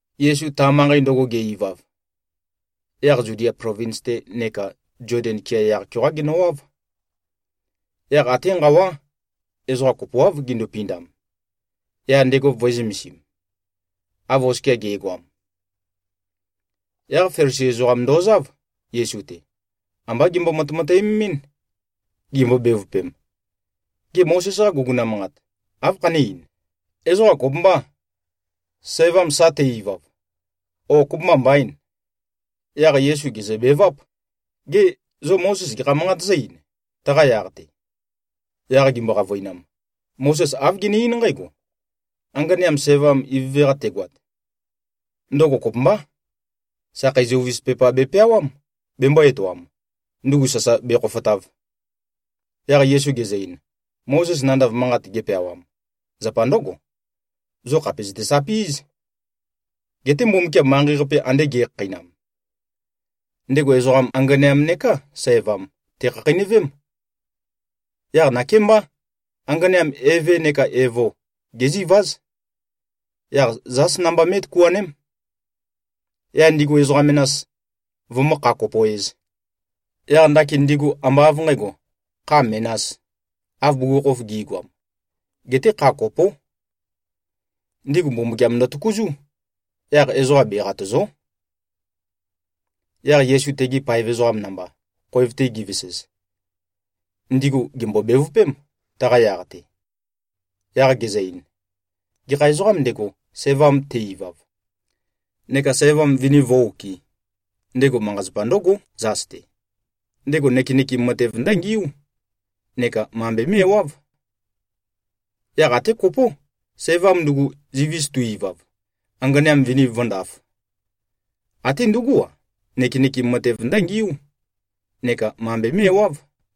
Yesu ta manqei ndøgo ge-ivav, yaq Zudia plovins-te neka Zoden kea yaq-keoqá genøwáv. Yaq até nqawá, ezoqa kopoáv gindupindam, yaq ndego vø̄e-zømesim, av oskia ge꞉goam. Yaq Felisi ezoqam ndozáv, Yesu-te. Ambá gembo-matemateømemín, gimbo-bevøpem, “Gê, Mozes-qa guguna manqat, áv khané-ein? Ezoqa kopømbâ, sævam sa te-ivav, ó, kopømba mbaîn?” Yaq Yesu gèzøbeváp, “Gê, zo Mozes gekha manqat zǿ-ein, taqa yaq-te?” Yaq gimbo-qavøinam, “Mozes āv gene-eín nqǽgo: Anganeam sævam ivøve-qa tegoat, ndøgo kopømbá. Sakhei zøuvis pepa bepeawám, bembō-etoam, ndugu sasa bekhofotav.” Yaq Yesu gezø-ein, “Mozes nandav manqat gepeawam, zapa ndǿgo: Zo khàpe zøtesapí꞉z. Geté Mbumbukiam manqei-qape ande ge꞉khakheinam, ndego ezoqam, anganeam neká sævam, tèkhakheinøvém. Yaq nakémbá, anganeam eve neka evo géziváz. Yaq zās namba mé꞉tøkuaném, yaq ndigu ezoqa menas, vømǿ-kha-kopo-ēz. Yaq ndakin ndigu ambá av nqǣgo, kha menās, av bugukhokhof gi꞉goam. Geté kha kopó. Ndigu Mbumbukiam ndøtøkuzú. Yaq ezoqa beqatø̀zo᷄.” Yaq Yesu tegi paev ezoqam namba, khoev-te givesez, ndigu gèmbo-bevøpém, taqa yaq-te. Yaq gezø-ein, “Gekha ezoqām ndego, sævam te-ivav neka sævam vini vǿ-okɨ̄, ndego manqa-zapa ndǿgó, zas-te. Ndego nøkenøkem matev ndǿngiú neka mambe mé꞉wáv. Yaq até kopó. Sævam ndugu, zivis tu-ivav, anganeam vini vǿndāf, até ndugú-a, nøkenøkem matev ndǿngiú neka mambe mé꞉wáv.”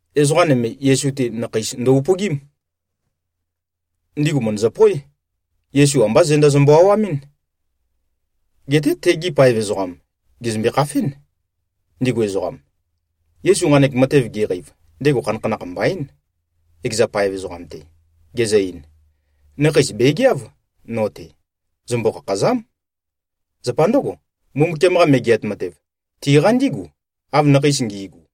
Ezoqa nøme, Yesu-te, nakheis ndo-upøgím. Ndigu mø̀ndøzøpoé, Yesu ambá zenda zømbø-awamɨ́n. Geté tegi paev ezoqam gèzømbe-khafén, ndigu ezoqam. Yesu nqanek matev geqeiv, ndego khanakhanakh mbaín, ekeza paev ezoqam-te, gezø-ein, “Nakheis bègeáv no-te. Zømbo-khakhàza᷄m. Zapa ndǿgo, Mbumbukiam-qa Megeat Matev, tiqa ndígu, av nakheis ngi꞉gu.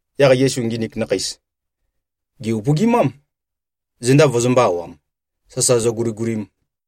Yaq Yesu nginik nakheis, gè-upøgimám, zenda vøzømbø̄-awam, sasa zøguligulim.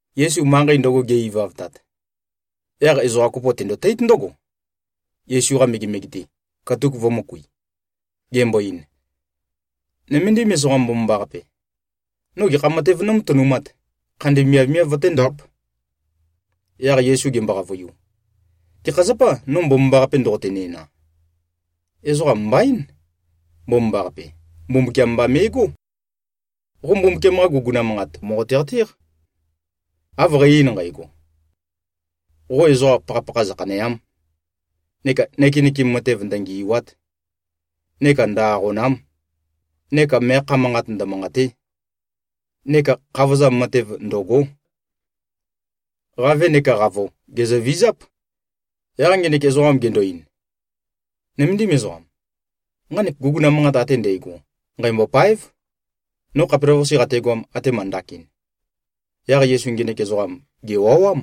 Yesu manqei ndøgo ge꞉-ivavtat, yaq ezoqa kopo tendotéit ndǿgo, Yesu-qa megemege-te, katuk vø̄møkui, gembo-ein, “Nøméndim ezoqam mbomambaqape. No gekha matev nómatønumāt, khandi miavmiav vøténdāp?” Yaq Yesu gembo-qavøiu, “Gekha zapâ no mbomambaqape ndoqote-næna? Ezoqa mbaín, mbomambaqape. Mbumbukiam mba me꞉gó. Qo Mbumbukiam-qa guguna manqat mòqote-qatéq, av qæ-ein nqægo, ‘Qo ezoqa pakhapakha zøkhanèa᷄m. Neka nøkenøkem matev ndøngì꞉wa᷄t. Neka ndø-aqòna᷄m. Neka meakha manqat ndømanqàte᷄. Neka khavozam matev ndø̀go᷄. Qavē neka qavo, gèzøvizáp.’” Yaq ngenek ezoqam gendo-ein, “Nøméndim ezoqam. Nqanek guguna manqat ate ndægo nqæmbôpáev, no khapelavøqase qategoam, atema ndakin.” Yaq Yesu ngenek ezoqam, gèwawám,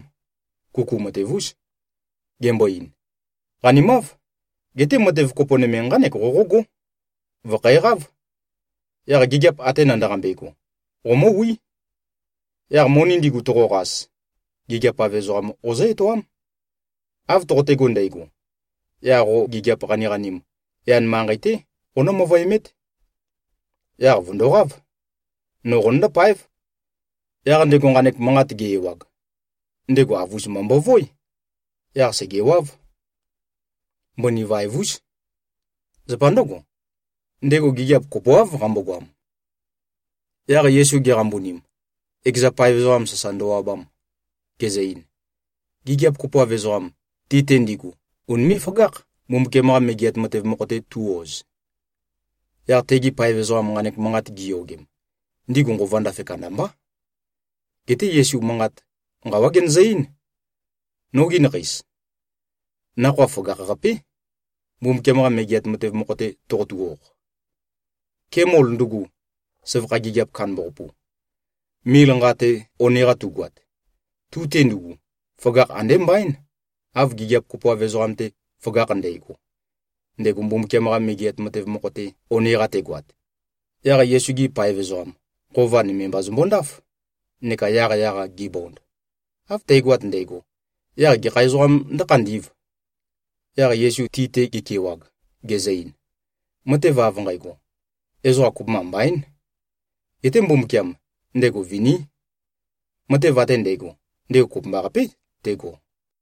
kuku matev-ús, gembo-ein, “Qanimáv. Geté matev kopo nøme nqánek qoqógó. Vø̀khæqáv. Yaq gigiap ate nandaqambe꞉go, qomǿwí. Yaq moni ndigu toqoqas, gigiap-av ezoqam qozǿ-etoám. Av toqotego ndægo, yaq qo gigiap qaniqanim, yan manqei-té qoqonǿ-møvøemét. Yaq vø̀ndoqáv. No qonøndó-páev.” Yaq ndego nqanek manqat ge-ewag, ndego avus-mba mbovoé. Yaq sègewáv. Mbøni vaev-ús. Zapa ndǿgo, ndego gigiap kopoáv qambogoam. Yaq Yesu geqambunim, ekeza paev ezoqam sasa ndøwabam, gezø-ein, “Gigiap kopoav ezoqam, ti-te ndigu unimé꞉-føgákh, Mbumbukiam-qa Megeat Matev mokho-te tu꞉-oz.” Yaq tegi paev ezoqam nqanek manqat giyogem, ndigu nqova ndafe kandambá. Geté Yesu manqat, nqawá genøzø-eín, “Nogi nakheis. Nakhoa føgakh-qapé, Mbumbukiam-qa Megeat Matev mokho-te toqotu-oq! Kemol ndugu, søvakha gigiap kandambaqapu, mil nqa-te one-qa tugoat, tu-te ndugu føgakh andé mbaín, av gigiap kopoav ezoqam-te føgakh ndægo, ndego Mbumbukiam-qa Megeat Matev mokho-te one-qa tegoat.” Yaq Yesu-gi paev ezoqam, nqova nøme mba zømbondáf, neka yaqyaq-a gibond, “Av tægoat ndægo, yaq gekha ezoqām ndǿkhandī꞉v?” Yaq Yesu ti-te gekewag, gezø-ein, “Matev av nqægo, ezoqa kopømba mbaín. Geté Mbumbukiam, ndego viní. Matev ate ndægo, ndego kopømbaqapé tego.”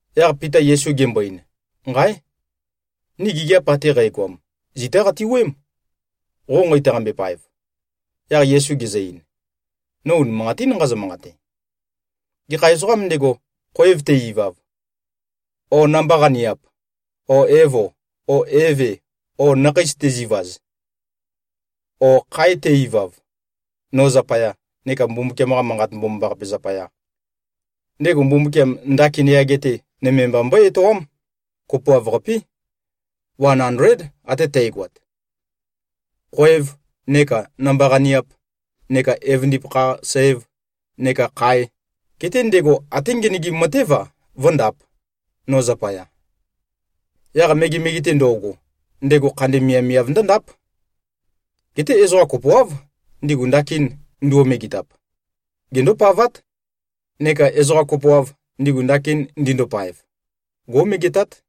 Yaq Pita Yesu gembo-ein, “Nqáe! Ni gigiap ate qægoam, zitá qati-wuøém, qo nqeitaqambe-paev.” Yaq Yesu gezø-ein, “No unimanqatín nqazø-manqate. Gekha ezoqām ndego, khoev te-ivav, o namba-qaniap o evo o eve o nakheis tezivaz, o khae te-ivav, no zapaya neka Mbumbukiam-qa Manqat Mbomambaqape zapaya, ndego Mbumbukiam ndakin yage-te nøme mba mbøé-etoám, kopoav-qapé, wan andléd ate tægoat, khoev, neka namba-qaniap, neka evøndipakha-sæv neka khae. Geté ndego até ngenøgim matév-a vǿndāp, no zapaya. Yaq megemege-te ndo꞉go, ndego khandi miavmiav ndǿndáp. Geté ezoqa kopoáv, ndigu ndakin nduo-megetap, gendópavát. Neka ezoqa kopoav, ndigu ndakin ndindopaev, gó꞉megetát.”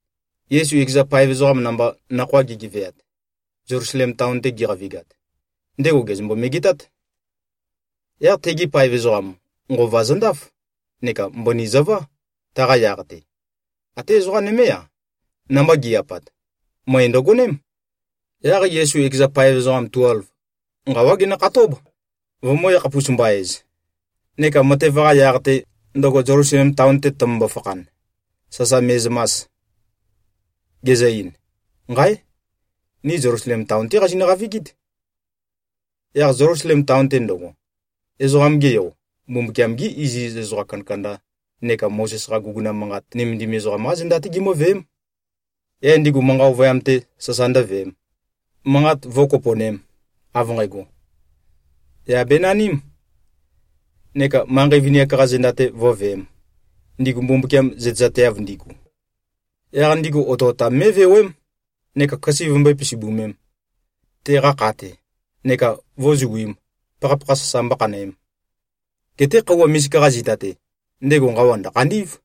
Yesu ekeza paev ezoqam namba nakhoa gigeveat, Zelusalem taon-te giqavigat, ndego gèzømbo-megetát. Yaq tegi paev ezoqam, nqova zøndáf neka mbøni zøvá, taqa yaq-te. Até ezoqa nømé-a, namba gi꞉-apat, møe ndøgoném. Yaq Yesu ekeza paev ezoqam tuelv, nqawá genøkhatób, vømø̄-yakhapus-mba-ez, neka matev-qa yaq-te, ndøgo Zelusalem taon-te tømømbo-fakhan, sasa me꞉zømas, gezø-ein, “Nqáe! Ni Zelusalem taon-té qazinø-qavigít. Yaq Zelusalem taon-te ndøgo, Ezoqam-ge Yo, Mbumbukiam-gi iziz ezoqa kandakanda neka Mozes-qa guguna manqat nømendim ezoqam-qá zenda-té gimǿveém. Yaq ndigu manqa ovøyam-te sasa ndǿveēm, manqat vǿkopo꞉nēm, av nqægo, yà benanīm, neka manqei vini-ak-qa zenda-te vǿveēm, ndigu Mbumbukiam zøtezateav ndigu. Yaq ndigu otøotam mé꞉vewém neka køse vømbøé-pisibømēm, teqa kha-te, neka vǿzuīm, pakhapakha sasa mbókhanøēm. Geté khøuwa misika-qa zita-te, ndego nqawa ndø̀khandí꞉v.”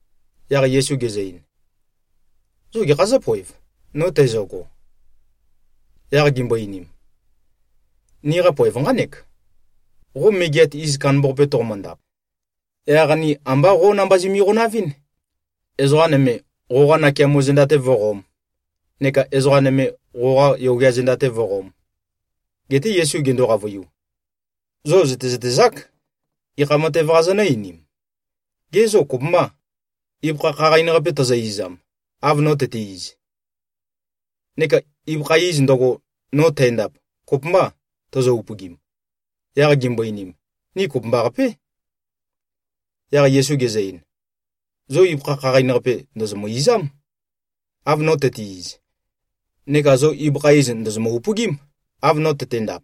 Yaq Yesu gezø-ein, “Zo gekhā zǿpoev, no tæzøgo?” Yaq gimbo-einim, “Niqa poev nqánek. Qo megeat iz kandambaqape toqomøndap, yaq ni ambá qo namba zimi-qonavɨ́n, ezoqa nøme, qoqa nakeamo zenda-te vǿqōm, neka ezoqa nøme, qoqa yogea zenda-te vǿqōm.” Geté Yesu gendo-qavøiu, “Zo zø̀tezøtezák, gekha matev-qa zonø̄-einim. Gê, zo kopømbâ, ibøkha khaqain-qape tozo-izam, av no tøte-iz? Neka ibøkha iz ndøgo, no tændap, kopømbâ tozo-upøgim?” Yaq gimbo-einim, “Ni kopømbaqapé.” Yaq Yesu gezø-ein, “Zo ibøkha khaqain-qape ndòzomø-izám, av no tøte-iz. Neka zo ibøkha iz ndòzomø-upøgím, av no tøtendap.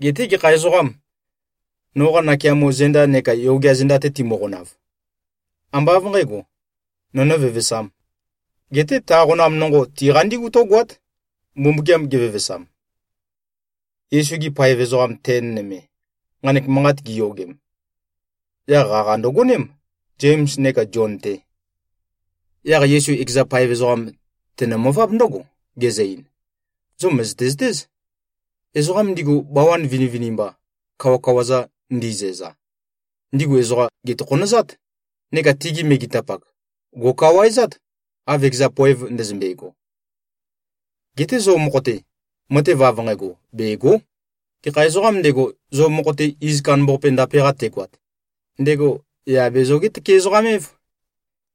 Geté gekha ezoqām, noqa nakeamo zenda neka yogea zenda-te timøqonav, ambá av nqǣgo, nō nǿvevesām. Geté ta qonam nonqo, tiqa ndígu tǿgoát, Mbumbukiam gevevesam.” Yesu-gi paev ezoqa ten nøme, nqanek manqat giyogem, yaq qaqa ndøgoném, Zems neka Zion-te. Yaq Yesu ekeza paev ezoqam tenø-møváb ndǿgo, gezø-ein, “Zo mø̀zøte-zøtéz. Ezoqa ndigu, bawan vinivinimba, kawakawa-za ndizæza, ndigu ezoqa gètokhonøzát. Neka tigi megetapak, gò꞉kawaezát, av ekeza poev ndøzømbe꞉go. Geté zo mokho-te, matev av nqægo bègo᷄. Gekha ezoqām ndego, zo mokho-te iz kandambaqape ndape-qa tegoat, ndego yà be-zoge-tøke-ezoqam-év.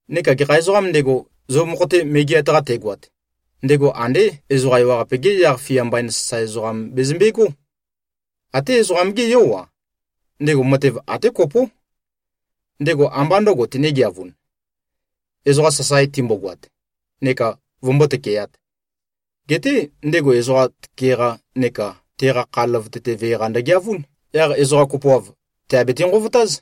Neka gekha ezoqām ndego, zo mokho-te megeat-qa tegoat, ndego andé ezoqa ewaqape-ge yaq-fia mbain sasae ezoqam bezømbegó. Até Ezoqam-gé Yó-a, ndego matev até kopó. Ndego ambá ndø̄go tenegeavūn, ezoqa sasae timbogoat neka vømbó-tøkeāt. Geté ndego ezoqa tøke-qa neka teqa kha løvøte-te vee-qa ndøgeavún. Yaq ezoqa kopoav, tèabete-nqovotáz.”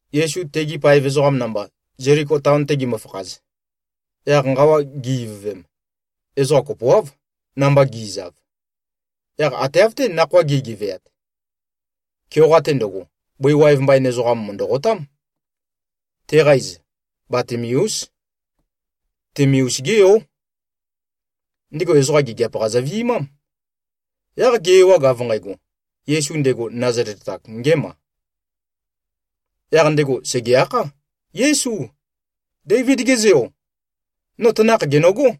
Yesu tegi paev ezoqam namba, Zeliko taon-te gimøfakhaz, yaq nqawa gi-ivøvem, ezoqa kopoáv, namba gi꞉zav. Yaq ate av-té nakhoa gi꞉geveat, keoqa-te ndøgo, bøi waev mbain ezoqam mø̀ndøqotám. Teqa iz Batimeús. Timeus-gé yó. Ndego ezoqa gigiap-qa zøvi꞉mám. Yaq ge-ewag av nqægo, Yesu, ndego Nazalet-ak ngēma, yaq ndego sège-akhá, “Yésu. Déivid-ge Zeo. No tanakh gènøgó.”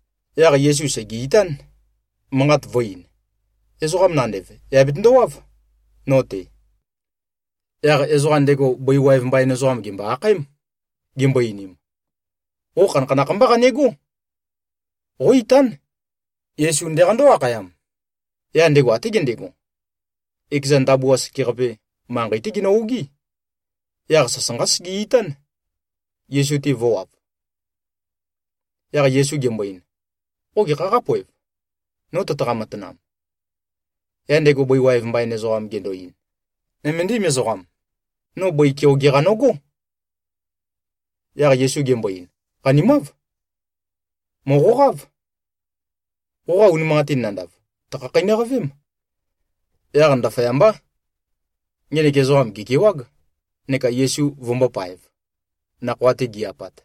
Yaq Yesu sège-itán, manqat vø̄-ein, “Ezoqam nandev, yà betøndowáv, no-te.” Yaq ezoqa ndego bøi waev mbain ezoqam gèmbo-akhaém, gimbo-einim, “Qo khanakhanakh mbá qanegó. Qó-itán. Yesu ndeqandó-akhayam.” Yaq ndego até gendego, ekeza ndabua sekeqape, manqei-té genø-ogí. Yaq sasanqá sege-itán, Yesu-te vø̄wav. Yaq Yesu gembo-ein, “Qo gekhā qápoe, no tøtaqa-matanam?” Yaq ndego bøi waev mbain ezoqam gendo-ein, “Nøméndim ezoqam. No bøi keoge-qa nøgó.” Yaq Yesu gembo-ein, “Qanimáv. Mòqoqáv. Qoqa unimanqatin nandav, tø̀khakheinøqavém.” Yaq ndaføyambá, ngenek ezoqam gèkewág, neka Yesu vømbōpaev, nakhoa-te gi-apat.